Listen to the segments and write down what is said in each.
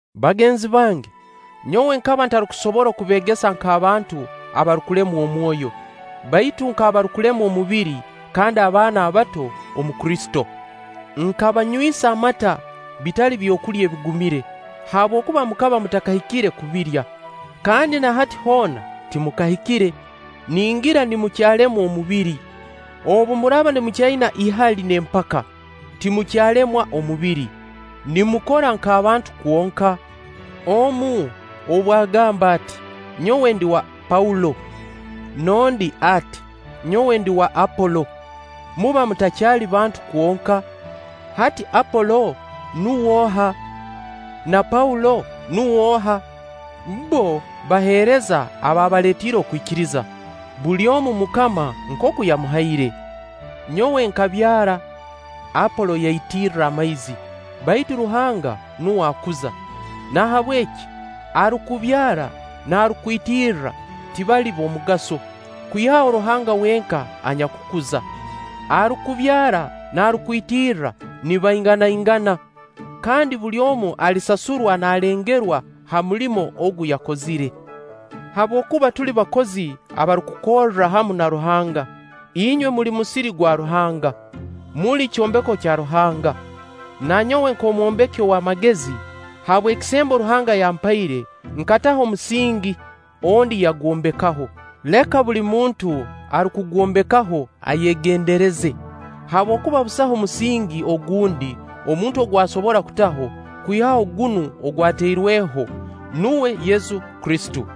Bagenzi bange, nyowe nkaba ntarukusobora kubeegesa nk'abantu abarukulemwa omwoyo, baitu nk'abarukulemwa omubiri, kandi abaana abato omu Kristo. Nkabanywisa amata, bitali byokulya ebigumire; habwokuba mukaba mutakahikire kubirya: kandi na hati hoona timukahikire, ningira nimukyalemwa omubiri. Obu muraaba mukyaina ihali n'empaka, timukyalemwa omubiri, nimukora nk'abantu kwonka? Omu, obu agamba ati: “Nyowe ndi wa Paulo”, n'ondi ati: “Nyowe ndi w'Apolo”, muba mutakyali bantu kwonka? Hati Apolo nuw'oha? Na Paulo nuw'oha? Bbo baheereza abaabaleetiire okwikiriza, buli omu MUKAMA nkooku yamuhaire. Nyowe nkabyara, Apolo yaitirra amaizi, baitu Ruhanga nuwe akuza. Nahabweki arukubyara n'arukwitirira tibali b'omugaso, kwihaho Ruhanga wenka anyakukuza. Arukubyara n'arukwitirra nibainganaingana, kandi buli omu alisasurwa naalengerwa ha mulimo ogu yakozire. Habwokuba tuli bakozi abarukukorra hamu na Ruhanga; inywe muli musiri gwa Ruhanga. Muli kyombeko kya Ruhanga. Na nyowe nk'omwombeki ow'amagezi, habw'ekisembo Ruhanga yampaire, nkataho omusingi, ondi yagwombekaho. Leka buli muntu arukugwombekaho ayegendereze. Habwokuba busaho musingi ogundi omuntu ogu asobora kutaho, kwihaho gunu ogwatairweho, nuwe Yesu Kristo.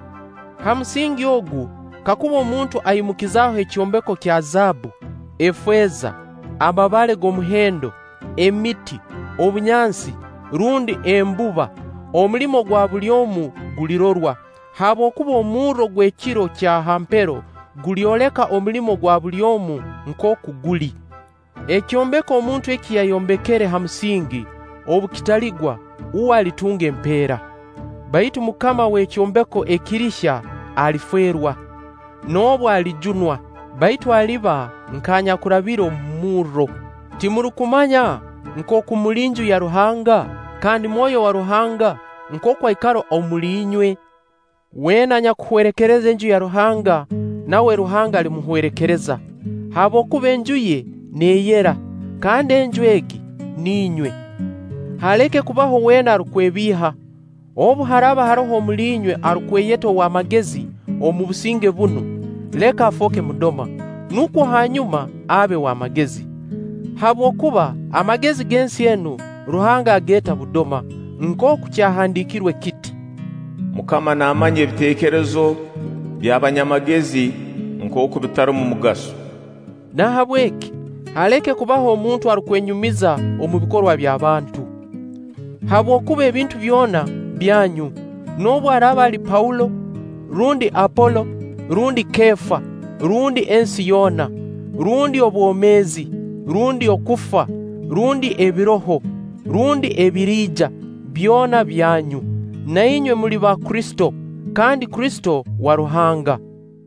Ha musingi ogu kakuba omuntu aimukizaho ekyombeko kya zaabbu, efeeza, amabaale g'omuhendo, emiti, obunyansi, rundi embuba omulimo gwa buli omu gulirorwa; habwokuba omurro gw'Ekiro kya ha mpero gulyoleka omulimo gwa buli omu nkooku guli. Ekyombeko omuntu eki yayombekere ha musingi obu kitaligwa, uwe alitunga empeera. Baitu mukama w'ekyombeko ekirihya, alifeerwa; noobu alijunwa, baitu aliba nk'anyakurabire omu murro. Timurukumanya nkooku muli Nju ya Ruhanga kandi Mwoyo wa Ruhanga nkooku aikara omuli inywe? Weena anyakuhwerekereza Enju ya Ruhanga, nawe Ruhanga alimuhwerekereza; habwokuba Enju ye neeyera, kandi Enju egi ninywe. Haleke kubabo weena arukwebiiha, obu haraaba haroho omuli inywe arukweyeta ow'amagezi omu businge bunu, leka afooke mudoma, nukwo hanyuma abe w'amagezi. Habwokuba amagezi g'ensi enu, Ruhanga ageeta budoma. Nkooku kyahandiikirwe kiti: “MUKAMA naamanya ebiteekerezo by'abanyamagezi nkooku bitarumu mugaso.” Nahabweki haleke kubaho omuntu arukwenyumiriza omu bikorwa by'abantu. Habwokuba ebintu byona byanyu, noobu araaba ali Paulo, rundi Apolo, rundi Keefa, rundi ensi yoona, rundi obwomeezi, rundi okufa, rundi ebiroho, rundi ebiriija, byona byanyu; na inywe muli ba Kristo: kandi Kristo wa Ruhanga.